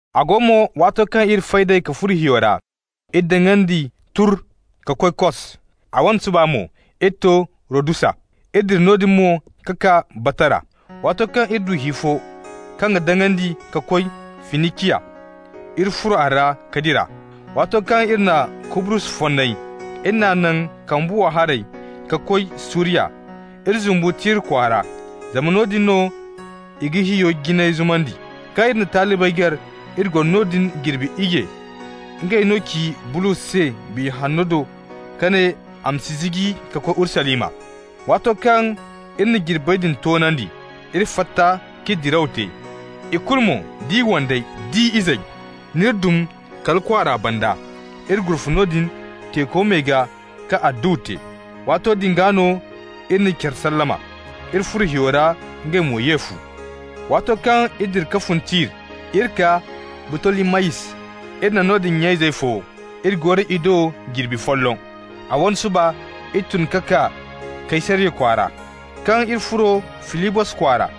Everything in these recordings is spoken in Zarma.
A go mo, waato kaŋ iri fay d'ey ka furo hiyo ra, iri daŋandi turr ka koy Kos. A wane suba mo, iri to Rodusa, iri dira noodin mo ka kaa Batara. Waato kaŋ iri du hi fo kaŋ ga daŋandi ka koy Finiciya, iri furo a ra ka dira. Waato kaŋ iri na Kubrus fonnay, iri n'a naŋ kambe wow haray ka koy Suriya. Iri zumbu Tir kwaara, zama noodin no i ga hiyo jinay zumandi. Kaŋ iri na talibey gar, iri goro noodin jirbi iyye. Ngey no ci Bulos se Biya Hanno do ka ne a ma si ziji ka koy Urusalima. Waato kaŋ iri na jirbey din toonandi, iri fatta k'iri diraw te. Ikulu mo, d'i wandey d'i izey, n'iri dum kala kwaara banda. Iri gurfa noodin teeko me gaa ka adduwa te. Waato din gaa no iri na care sallama. Iri furo hiyo ra, ngey mo ye fu. Waato kaŋ iri dira ka fun Tir, iri kaa Butolimayis, iri na noodin nya-izey fo, iri goro i do jirbi folloŋ. A wane suba, iri tun ka kaa Kaysariya kwaara. Kaŋ iri furo Filibos kwaara,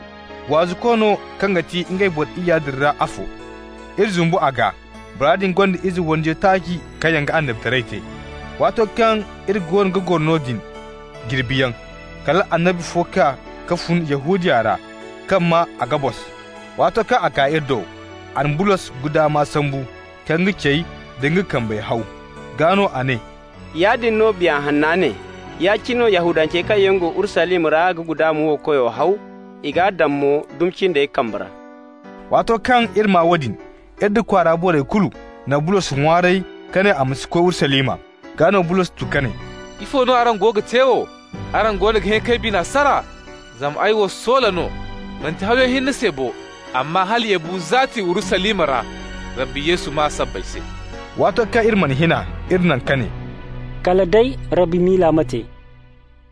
waazuko no kaŋ ga ti ngey boro iyya din ra afo, iri zumbu a gaa. Bora din gonda ize wandiyo taaci kaŋ yaŋ ga annabitaray te. Waato kaŋ iri goono ga goro noodin jirbiyaŋ, kala annabi fo kaa ka fun Yahudiya ra kaŋ maa Agabos. Waato kaŋ a kaa iri do, a na Bulos guddama sambu ka nga cey da nga kambey haw. Gaa no a ne: «Yaadin no Biya Hanna ne: Ya-cine no Yahudancey kaŋ go Urusalima ra ga guddama wo koyo haw. I g'a daŋ mo dumi cindey kambe ra.» Waato kaŋ iri maa woodin, iri nda kwaara borey kulu na Bulos ŋwaaray ka ne a ma si koy Urusalima. Gaa no Bulos tu ka ne: «Ifo no araŋ goono ga te wo, araŋ goono ga hẽ k'ay bine sara? Zama ay wo soola no, manti hawyaŋ hinne se bo, amma hala ya bu zaati Urusalima ra Rabbi Yesu maa sabbay se.» Waato kaŋ iri mana hin a, iri naŋ, ka ne: «Kala day Rabbi miila ma te.»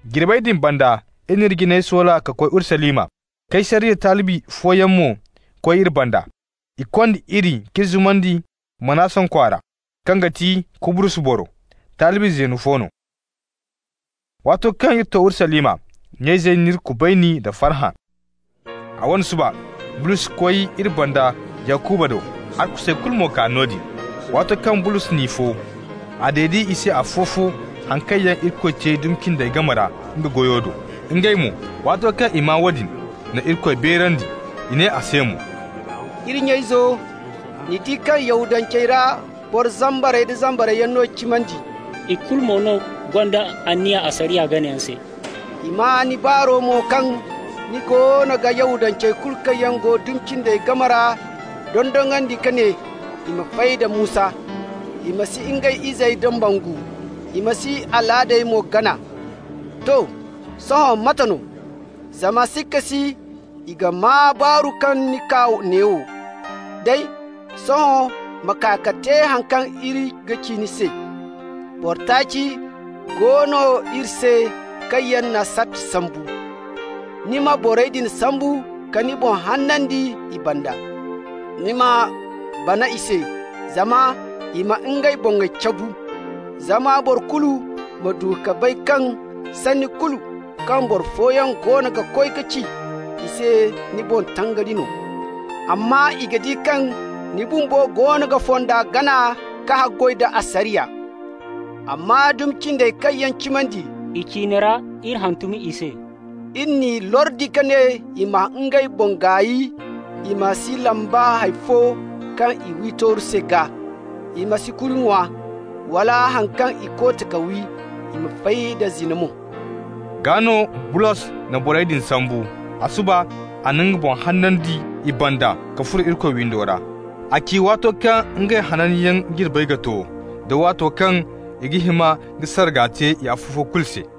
Jirbey din banda iri n'iri jinay soola ka koy Urusalima. Kaysariya talibi fooyaŋ mo koy iri banda. I kond'iri k'iri zumandi Manason kwaara, kaŋ ga ti Kubrus boro, talibi zeeno fo no. Waato kaŋ iri to Urusalima, nya-izey n'iri kubayni nda farhã. A wane suba, Bulos koy iri banda Yakuba do, arkusey kulu mo kaa noodin. Waato kaŋ Bulos n'i fo, a dede i se afo-fo haŋ kaŋ yaŋ Irikoy te dumi cindey game ra nga goyo do. Ngey mo, waato kaŋ i maa woodin, na Irikoy beerandi. I ne a se mo: «Iri nya-izo, ni di kaŋ Yahudancey ra boro zambar-zambar yaŋ no cimandi, ikulu mo no gonda anniya asariya ganayaŋ se. I maa ni baaru mo kaŋ ni goono ga Yahudancey kulu kaŋ yaŋ go dumi cindey game ra dondonandi ka ne i ma fay da Musa: i ma si ngey izey dambangu, i ma si alaadey mo gana. To, sohõ mate no? Zama sikka si i ga maa baaru kaŋ ni kaa neewo. Day, sohõ ma kaa ka te haŋ kaŋ iri ga ci ni se. Boro taaci go no iri se kaŋ yaŋ na sarti sambu. Ni ma borey din sambu ka ni boŋ hanandi i banda. Ni ma bana i se, zama i ma ngey boŋey cabu. Zama boro kulu ma du ka bay kaŋ sanni kulu kaŋ boro fooyaŋ goono ga koy ci i se ni boŋ taari no! Amma i ga di kaŋ ni bumbo goono ga fonda gana ka haggoy da asariya. Amma dumi cindey kaŋ yaŋ cimandi, i ciine ra iri hantum i se. Iri n'i lordi ka ne i ma ngey boŋ gaay i ma si lamba hay fo kaŋ i wi tooru se gaa, i ma si kuri ŋwa, wala haŋ kaŋ i koote ka wi, i ma fay da zina mo.» Gaa no Bulos na borey din sambu. A suba a na nga boŋ hanandi i banda ka furo Irikoy windo ra. A ci waato kaŋ ngey hananyaŋ jirbey ga to, da waato kaŋ i ga hima ka sarga te i afo-fo kulu se.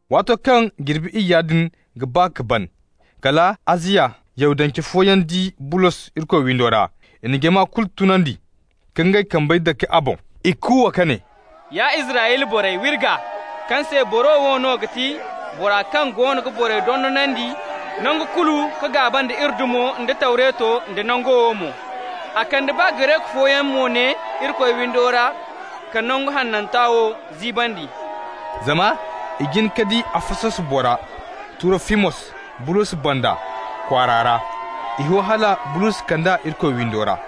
Waato kaŋ jirbi iyya din ga ba ka ban, kala Aziya Yahudance fooyaŋ di Bulos Irikoy windo ra. I na jama kulu tunandi ka ngey kambey dake a boŋ. I kuuwa ka ne: «Ya Israyla borey, wa iri gaa! kaŋ se boro wo no ga ti bora kaŋ goono ga boro kulu dondonandi nangu kulu ka gaaba nda iri dumo nda Tawreto, da nangu wo mo. A kande baa Gareku fooyaŋ mo ne Irikoy windo ra ka nangu hananta wo ziibandi.» (Zama i jin ka di Afasos bora Turofimos Bulos banda kwaara ra. I ho hala Bulos kand'a Irikoy windo ra.)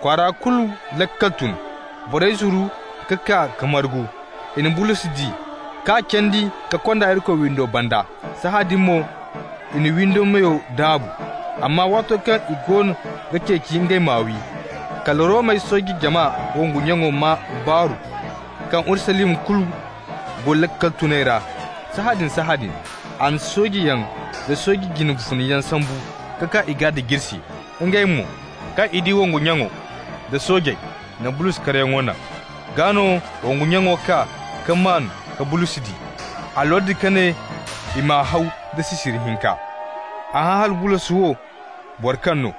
Kwaara kulu laakal tun, borey zuru ka kaa ka margu. I na Bulos di, ka candi ka kond'a Irikoy windo banda. Sahãadin mo i na windo meyey daabu. Amma waato kaŋ i goono ga ceeci ngey m'a wi, kala Romey sooje jama wongu nyaŋo maa baaru kaŋ Urusalima kulu go laakal tunay ra. Sahãadin-sahãadin, a na soojeyaŋ da sooje jine funayaŋ sambu ka kaa i gaa da jirsi. Ngey mo, kaŋ i di wongu nyaŋo da soojey, na Bulos karyaŋo naŋ. Gaa no wongu nyaŋo kaa ka maan ka Bulos di. A lordi ka ne i m'a haw da sisiri hinka. A hã hala Bulos wo boro kaŋ no,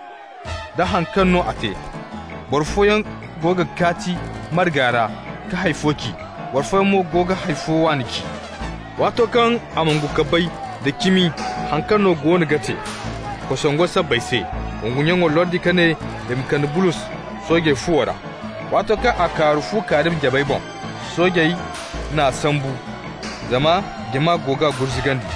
da haŋ kaŋ no a te. Boro fooyaŋ go ga kaati marga ra ka hay fo ci, boro fooyaŋ mo go ga hay fo waani ci. Waato kaŋ a mongo ka bay da cimi haŋ kaŋ no goono ga te kosongo sabbay se, wongu nyaŋo lordi ka ne i ma kande Bulos soojey fuwo ra. Waato kaŋ a kaaru fu kaarimi jabey boŋ, soojey n'a sambu zama jama go g'a gurzugandi.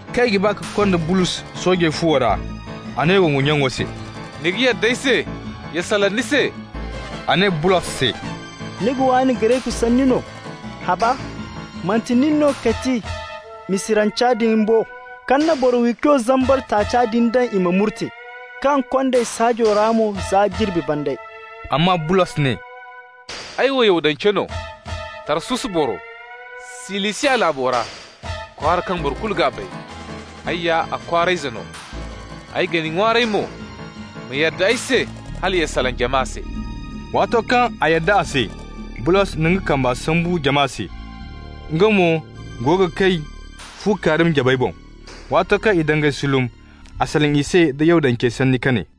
Kaŋ i ga ba ka konda Bulos soojey fuwo ra, a ne wongu nyaŋo se: «Ni ga yadda ay se ya salaŋ ni se?» A ne Bulos se: «Ni ga waani Gareku sanni no? Haba, manti nin no ga ti Misiranca din bo, kaŋ na boro-wiiko zambar taaca din daŋ i ma murte, kaŋ kond'ey saajo ra mo za jirbi bandey?» Amma Bulos ne: «Ay wo Yahudance no, Tarsus boro, Silisiya laabo ra, kwaara kaŋ boro kulu ga bay, ay ya a kwaara ize no. Ay ga ni ŋwaaray mo, ma yadda ay se hala ya salaŋ jama se.» Waato kaŋ a yadda a se, Bulos na nga kamba sambu jama se. Nga mo go ga kay fu kaarimi jabey boŋ. Waato kaŋ i dangay sulum, a salaŋ i se da Yahudancey sanni ka ne: